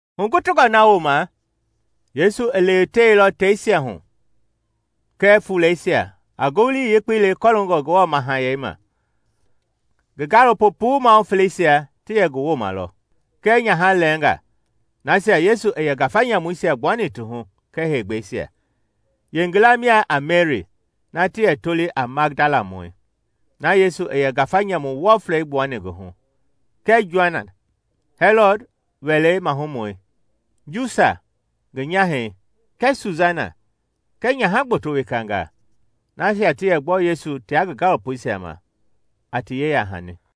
Hugutungɔ na wooma Yesu i lewetewelɔ teisia hu kɛɛ fuleisia a Ngowili Yekpei le kɔloongɔ Ngewɔ Mahayɛi ma. Ngi gaalopo puu mahu feleisia ti yɛ ngi wooma lɔ. Kɛɛ nyaha lɛɛnga, nasia Yesu i yɛ ngafa nyamuisia gbuani ti hu kɛɛ heegbɛisia. Yeengila mia a Meri na ti yɛ toli a Madalamɔi, na Yesu i yɛ ngafa nyamu wɔflɛi gbuani ngi hu, kɛɛ Joana, Hɛlɔd wɛlei mahumɔi Njusa ngi nyahɛi kɛɛ Susana kɛɛ nyaha gboto wekanga, nasia ti yɛ gbɔ Yesu tia ngi gaalopoisia ma a ti yeya-hani.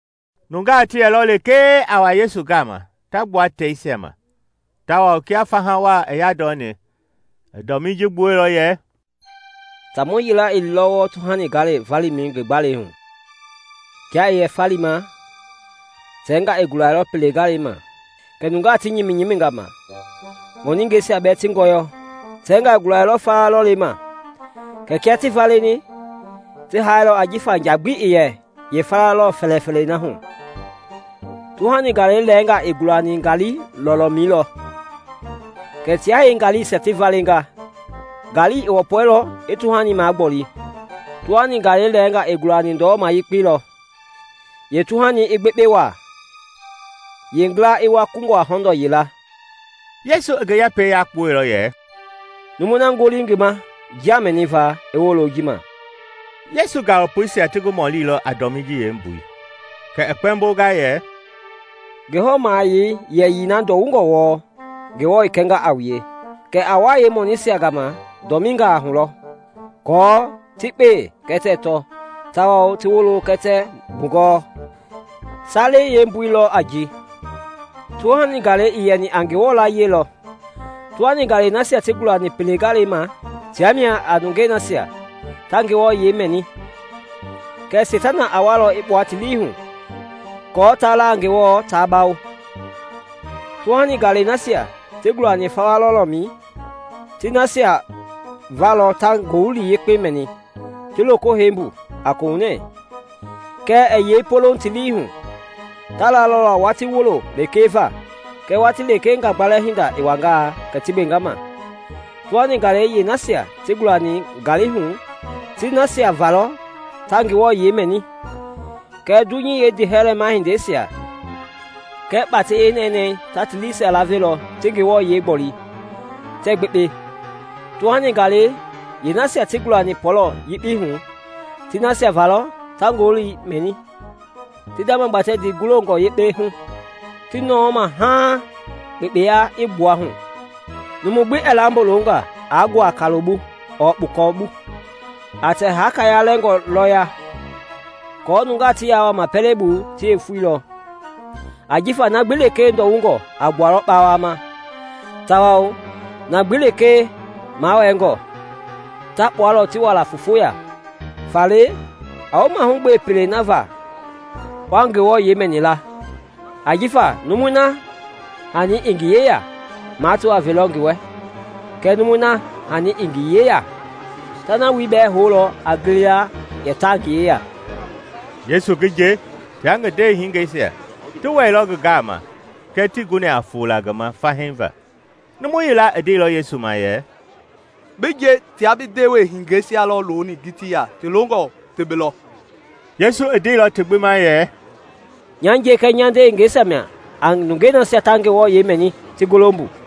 Nungaa ti yɛlɔ lekee a wa Yesu gama ta gbua teisia ma; tawao kia faha wa i yandɔni, i dɔmii ji gbuɛilɔ yɛ, “Taamɔ yila i liilɔ wɔɔ tuhani galɛi valima ngi gbalei hu. Kia i yɛ falima, tɛngaa i gulailɔ pele galei ma, kɛ nungaa ti nyiminga ma, ŋɔningɛisia bɛɛ ti ngɔyɔ. Tɛngaa i gulailɔ fawa lɔlei ma kɛɛ kia ti valeni, ti hailɔ ajifa nja gbi ii yɛ yeepɔlɔ fɛlɛfɛlɛi hu. Tuhani galɛi lɛɛnga i gulani ngaali lɔlɔmɛi lɔ, kɛ tia yeengaliisia ti valinga, ngaali i wɔpɔilɔ i tuhani magboli. Tuhani galɛi lɛɛnga i gulani ndɔlɔma yekpei lɔ; yeetuhani i gbekpe wa, yeengila i wua kungɔ a hɔndɔɔ yila.” Yesu i ngi yɛpɛi yakpuɛilɔ yɛ, “Numui na ngoli ngi ma njia mɛniva, i wolo ji ma.” Yesu gaalopoisia ti ngi mɔlilɔ a dɔmii ji yeembui, kɛ i kpɛmbonga yɛ, “Ngewɔ mahayɛi yɛyii na ndɔwungɔ wɔɔ, Ngewɔ i kɛnga a wue, kɛɛ a wa yeemɔniisia gama dɔminga hu lɔ, aako ti kpee kɛɛ tɛɛ tɔ, tawao ti wolo kɛɛ tɛɛ mbugɔɔ. “Salei yeembui lɔ a ji: tuhani galɛi i yɛni a Ngewɔ layie lɔ. Tuhani galɛi nasia ti gulani pele galɛi ma tia mia a nungei nasia ta Ngewɔ yiɛi mɛni; kɛɛ Seitana a walɔ i kpua ti lii hu aako taa la a Ngewɔ ta bawo. Tuhani galɛi nasia ti gulani fawa lɔlɔmɛi ti na nasia va lɔ ta Ngowili Yekpei mɛni, ti loko hei mbu a kohunɛ. Kɛɛ ɛɛ yei poloŋ ti lii hu; ta lalɔ la watii wulo lekee va, kɛɛ watii lekee ngagbalɛ hinda i wangaa kɛ ti gbenga ma. Tuhani galɛi yeenasia ti gulani ngali hu ti nasia va lɔ ta Ngewɔ yiɛi mɛni, kɛɛ dunyei yeendiihɛlɛ mahindeisia kɛɛ kpatɛi yeenɛnɛɛi ta ti liisia lavelɔ ti Ngewɔ yiɛi gboli, tɛɛ gbekpe. Tuhani galɛi yeenasia ti gulani pɔlɔ yekpei hu ti nasia va lɔ ta Ngowili mɛni, ti ndamagbatɛ ndii golongɔ yekpe hu, ti nɔɔ ma haaŋ kpekpeya i gbua hu. “Numu gbi ɛɛ lambo longa aa nguaa kaloi bu ɔɔ kpukɔ. A tɛ haka yalɛngɔ lɔ ya aako nungaa ti ya wuama pɛlei bu ti yeefoi lɔ. “Ajifa na gbi lekee ndɔwungɔ a gbualɔ kpawama, tawao na gbi lekee mawɛɛngɔ, ta kpualɔ ti wa la foofo ya. “Faale a wu mahugbe pelei na va wa Ngewɔ yiɛi mɛni la; ajifa numui na hani i ngi yeya, mato a velɔ ngi wɛ, kɛɛ numui na hani ii ngi yeya, ta na wuloi bɛɛ houlɔ a gili la yɛ ta ngi yeya.” Yesu ngi nje tia ngi ndewehingeisia ti wɛilɔ ngi gama kɛɛ tii guni a fola ngi ma fahii va. Numu yila i ndeilɔ Yesu ma yɛ, “Bi nje tia bi ndewehingeisia lɔ looni ngitii ya ti longɔ ti bi lɔ.” Yesu i ndeilɔ ti gbi ma yɛ, “Nya nje kɛɛ nya ndewehingeisia mia a nungei nasia ta Ngewɔ yiɛi mɛni ti golo mbu.”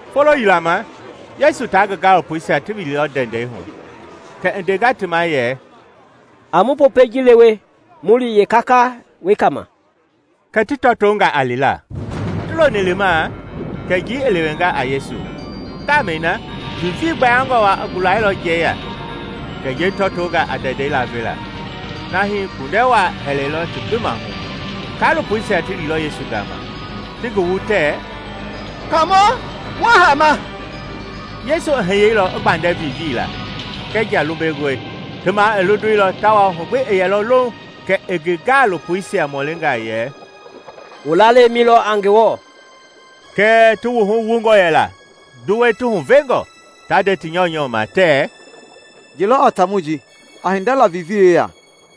Folo yila ma Yesu ta ngi gaalopoisia ti wiliilɔ ndɛndɛi hu kɛ i ndenga ti ma yɛ, “A mu Popɛi ji lewe mu li yeekaka wekei ma.” Kɛ ti tɔtonga a lila. Ti loni limaa kɛ njii i lewenga a Yesu. Ngamɛi na vivii gbayangɔ wa i gulailɔ njɛi ya, kɛ njɛi tɔtonga a ndɛndɛi lavela, na hii kpundɛ wa i hɛlɛilɔ ti gbi mahu. Kaalopoisia ti liilɔ Yesu gama, ti ngi wu tɛɛ, “Kaamɔ! Mua haama!” Yesu i hiyeilɔ i gbandɛ vivii la kɛɛ nja lumbengɔi; ti ma i londeilɔ tawao hu gbi i yɛilɔ louŋ. Kɛ i ngi gaalopoisia mɔlinga yɛ, “Wu lalɛi lɔ mi a Ngewɔ?” Kɛɛ ti wuhu wungɔ yɛla, duwei ti huvenga, ta nde ti nyɔunyɔu ma tɛɛ, “Ye lɔ a taamɔi ji? A hinda la vivii yeya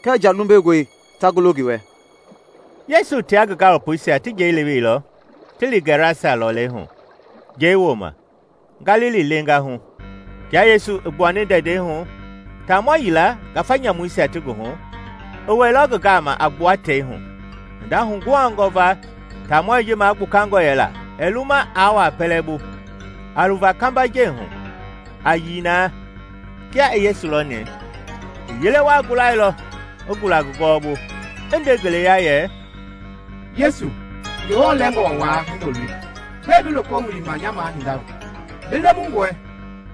kɛɛ nja lumbengɔi ta golo ngi wɛ!” Yesu tia ngi gaalopoisia ti njɛi leweilɔ ti li Gɛrasa lɔlei hu, njɛi wooma, Galili leenga hu. Kia Yesu i gbuani ndɛndɛi hu, taamɔ yila, ngafa nyamuisia ti ngi hu, i wɛilɔ ngi gama a gbua tei hu. Hinda huguhangɔ va taamɔi ji magbukangɔ yɛla, ɛɛ luma aa wua pɛlɛ bu, a luva kambajɛi hu, a yii na. Kia i Yesu lɔni, i yele wa gulailɔ, i gula ngi gɔwɔbu, i nde ngeleya yɛ, “Yesu, Ngewɔ Lɛngɔ Wai Hindoloi! Gbɛɛ bi loko wilima nya mahinda hu? Bi lemungɔe,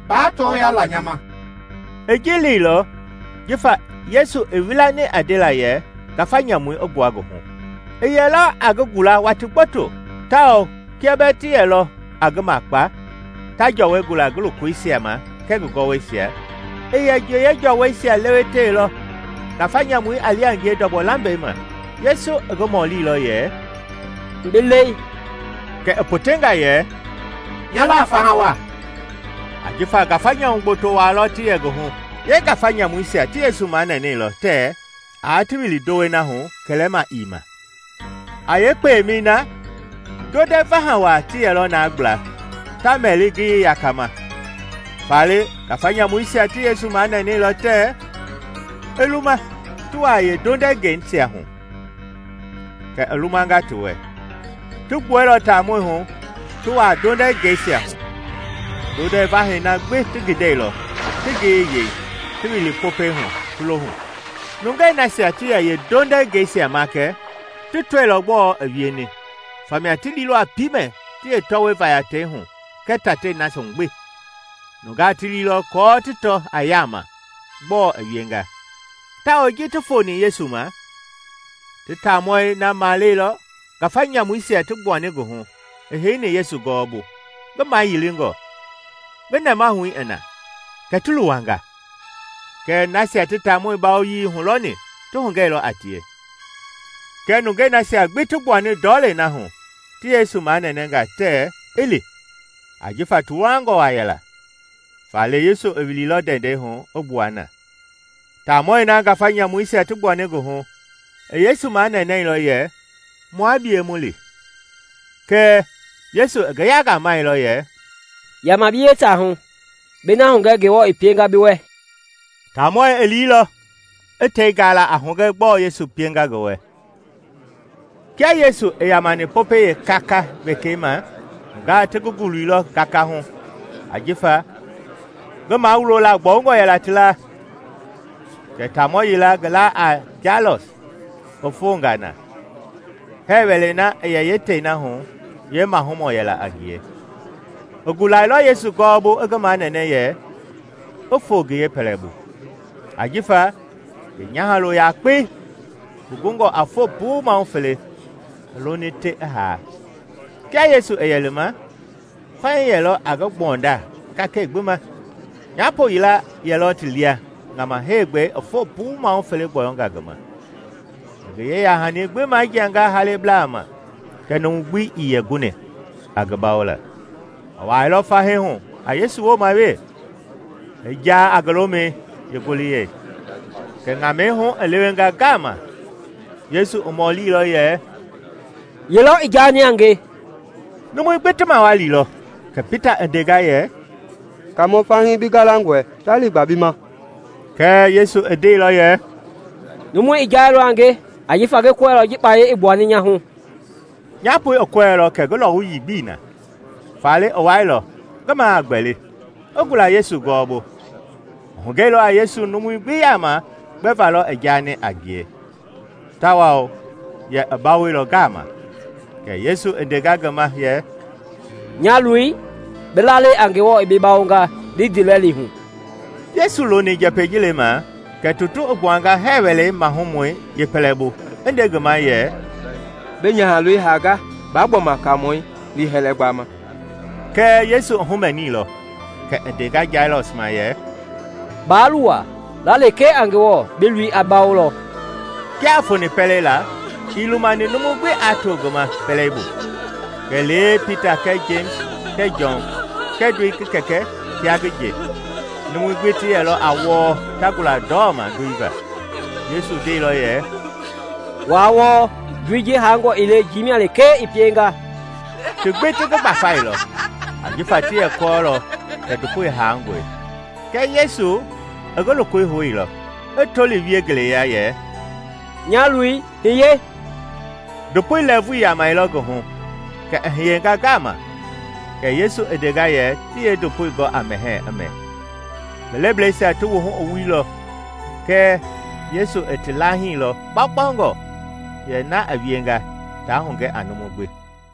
ba tɔɔya la nya ma!” I ji leilɔ jifa Yesu i wilani a ndela yɛ ngafa nyamui i gbua ngi hu. I yɛlɔ a ngi gula watii gboto, tawao kia bɛɛ ti yelɔ a ngi makpa, ta jɔwɔi gula ngi lokoisia ma kɛɛ ngi gɔwɔisia, i yɛ yeejɔwɔisia lewetewelɔ, ngafa nyamui a li a ngie ndɔgbɔ lambɛi ma. Yesu i ngi mɔlilɔ yɛ, “Bi lɛi?” Kɛ i potenga yɛ, “Nya la a Fahawa” ajifa ngafa nyamu gboto wa lɔ ti yɛ ngi hu. Yeengafa nyamuisia ti Yesu manɛnɛilɔ tɛɛ aa ti wili ndowei na hu kɛlɛma ii ma. A yeekpemɛi na ndondɛ vaha wa ti yɛlɔ na gbla, ta mɛli ngiyei yakama. Faale ngafa nyamuisia ti Yesu manɛnɛilɔ tɛɛ i luma ti wua yeendondɛngɛisia hu, kɛ i lumanga ti wɛ. Ti gbuɛilɔ taamɔi hu, ti wua ndondɛngɛisia hu. Ndondɛ vahɛi na gbi ti gindɛilɔ, ti ngiyei yei, ti wili Popɛi hu, ti lo hu. Nungei nasia ti yɛ yeendondɛngɛisia makɛ ti tɔilɔ gbɔɔ i wieni, famia ti liilɔ a piimɛ ti yeetɔwɔi vaya tei hu kɛɛ tatei na hu gbi. Nungaa ti liilɔ aako ti tɔ a yama gbɔɔ i wienga, tawao ji ti foni Yesu ma, ti taamɔi na maleilɔ ngafa nyamuisia ti gbuani ngi hu i heini Yesu gɔwɔbu, ngi mayilingɔ, ngi nɛmahui i na; kɛ ti luwanga. Kɛɛ nasia ti taamɔi bawoyii hulɔni ti hugɛilɔ a tie. Kɛ nungei nasia gbi ti gbuani ndɔlei na hu ti Yesu manɛnɛnga tɛɛ i li, ajifa ti luwangɔ wa yɛla. Faale Yesu i wiliilɔ ndɛndɛi hu i gbua na. Taamɔi na ngafa nyamuisia ti gbuani ngi hu i Yesu manɛnɛilɔ yɛ, “Mua bie mu li.” Kɛɛ Yesu i ngi yangamɛilɔ yɛ, “Yama bi yeetaahu, bi na hugɛ Ngewɔ i pienga bi wɛ.” Taamɔi i liilɔ, i tei gala a hugɛ gbɔɔ Yesu pienga ngi wɛ. Kia Yesu i yamani Popɛi yeekaka wekei ma nungaa ti ngi guluilɔ gaka hu ajifa ngi mawulola gbɔungɔ yɛla ti la. Kɛ taamɔ yila ngi la a Jailɔs i fonga na; hɛɛ wɛlei na i yɛ yeetei na hu yeemahumɔ yɛla a ngie. I gulailɔ Yesu gɔwɔbu i ngi manɛnɛ yɛ i foo ngi yeepɛlɛbu, ajifa ngi nyahalo yakpei, ngi gungɔ a foo puu mahu fele, i loni te i haa. Kia Yesu i yɛ lima, fahii yɛlɔ a ngi gbɔnda kakɛi gbi ma. Nyapo yila yɛlɔ ti lia ŋama heegbɛi i foo puu mahu fele gbɔyɔnga ngi ma; i ngi yeya-hani gbi majianga halebla ma kɛɛ numu gbi ii yɛ guni a ngi bawola. I wailɔ fahii hu a Yesu wooma wee, i ja a ngi lomɛi yeengoliyɛi, kɛ ŋamɛi hu i lewenga ngama. Yesu i mɔlilɔ yɛ, “Ye lɔ i jani a nge?” Numui gbi ti mawalilɔ, kɛ Pita i ndenga yɛ, “Kaamɔ, fahii bi galangɔe, ta liigba bi ma.” Kɛɛ Yesu i ndeilɔ yɛ, “Numu i jailɔ a nge, ajifa ngi kɔɛilɔ ji kpaya i gbuani nya hu.” Nyapoi i kɔɛilɔ kɛ ngi lɔwuyii gbii na, faale i wailɔ, ngi ma a gbɛli, i gula Yesu gɔwɔbu. I hugɛilɔ a Yesu numui gbi yama gbɛva lɔ i jaani a ngie tawao yɛ i bawoilɔ ngama. Kɛ Yesu i ndenga ngi ma yɛ, “Nya loi, bi lalɛi a Ngewɔ i bi bawonga. Li ndiilɛli hu.” Yesu i loni njɛpɛi ji lemaa kɛ tutu i gbuanga hɛɛ wɛlei mahumɔi yeepɛlɛbu i nde ngi ma yɛ, “Bi nyahaloi i hanga, ba gbɔma Kaamɔi liihɛlɛ gbama.” Kɛɛ Yesu i humɛniilɔ kɛ i ndenga Jailɔs ma yɛ, “Baa luwa; la lekee a Ngewɔ, bi loi a bawolɔ.” Kia i foni pɛlei la, ii lumani numu gbi aa to ngi ma pɛlei bu kɛlee Pita kɛɛ Jemisi kɛɛ Jɔn kɛɛ ndoi ngi kɛkɛ tia ngi nje. Numui gbi ti yɛlɔ a wɔɔ ta gula ndɔma ndoi va. Yesu ndeilɔ yɛ, “Waa wɔɔ; ndoi ji hangɔ ii le njii mia lekee i pienga!” Ti gbi ti ngi gbafailɔ, ajifa ti yɛ kɔɔlɔ kɛ ndopoi hangɔe. Kɛɛ Yesu i ngi lokoi houilɔ, i toli wie ngeleya yɛ, “Nya loi, hiye!” Ndopoi lɛɛvui i yamɛilɔ ngi hu kɛ i hiyenga ngama, kɛ Yesu i ndenga yɛ ti yeendopoi gɔ a mɛhɛɛ i mɛ. Ngi lebleisia ti wuhu i wuilɔ kɛɛ Yesu i ti lahiilɔ kpaukpaungɔ yɛ na i wienga ta hugɛ a numu gbi.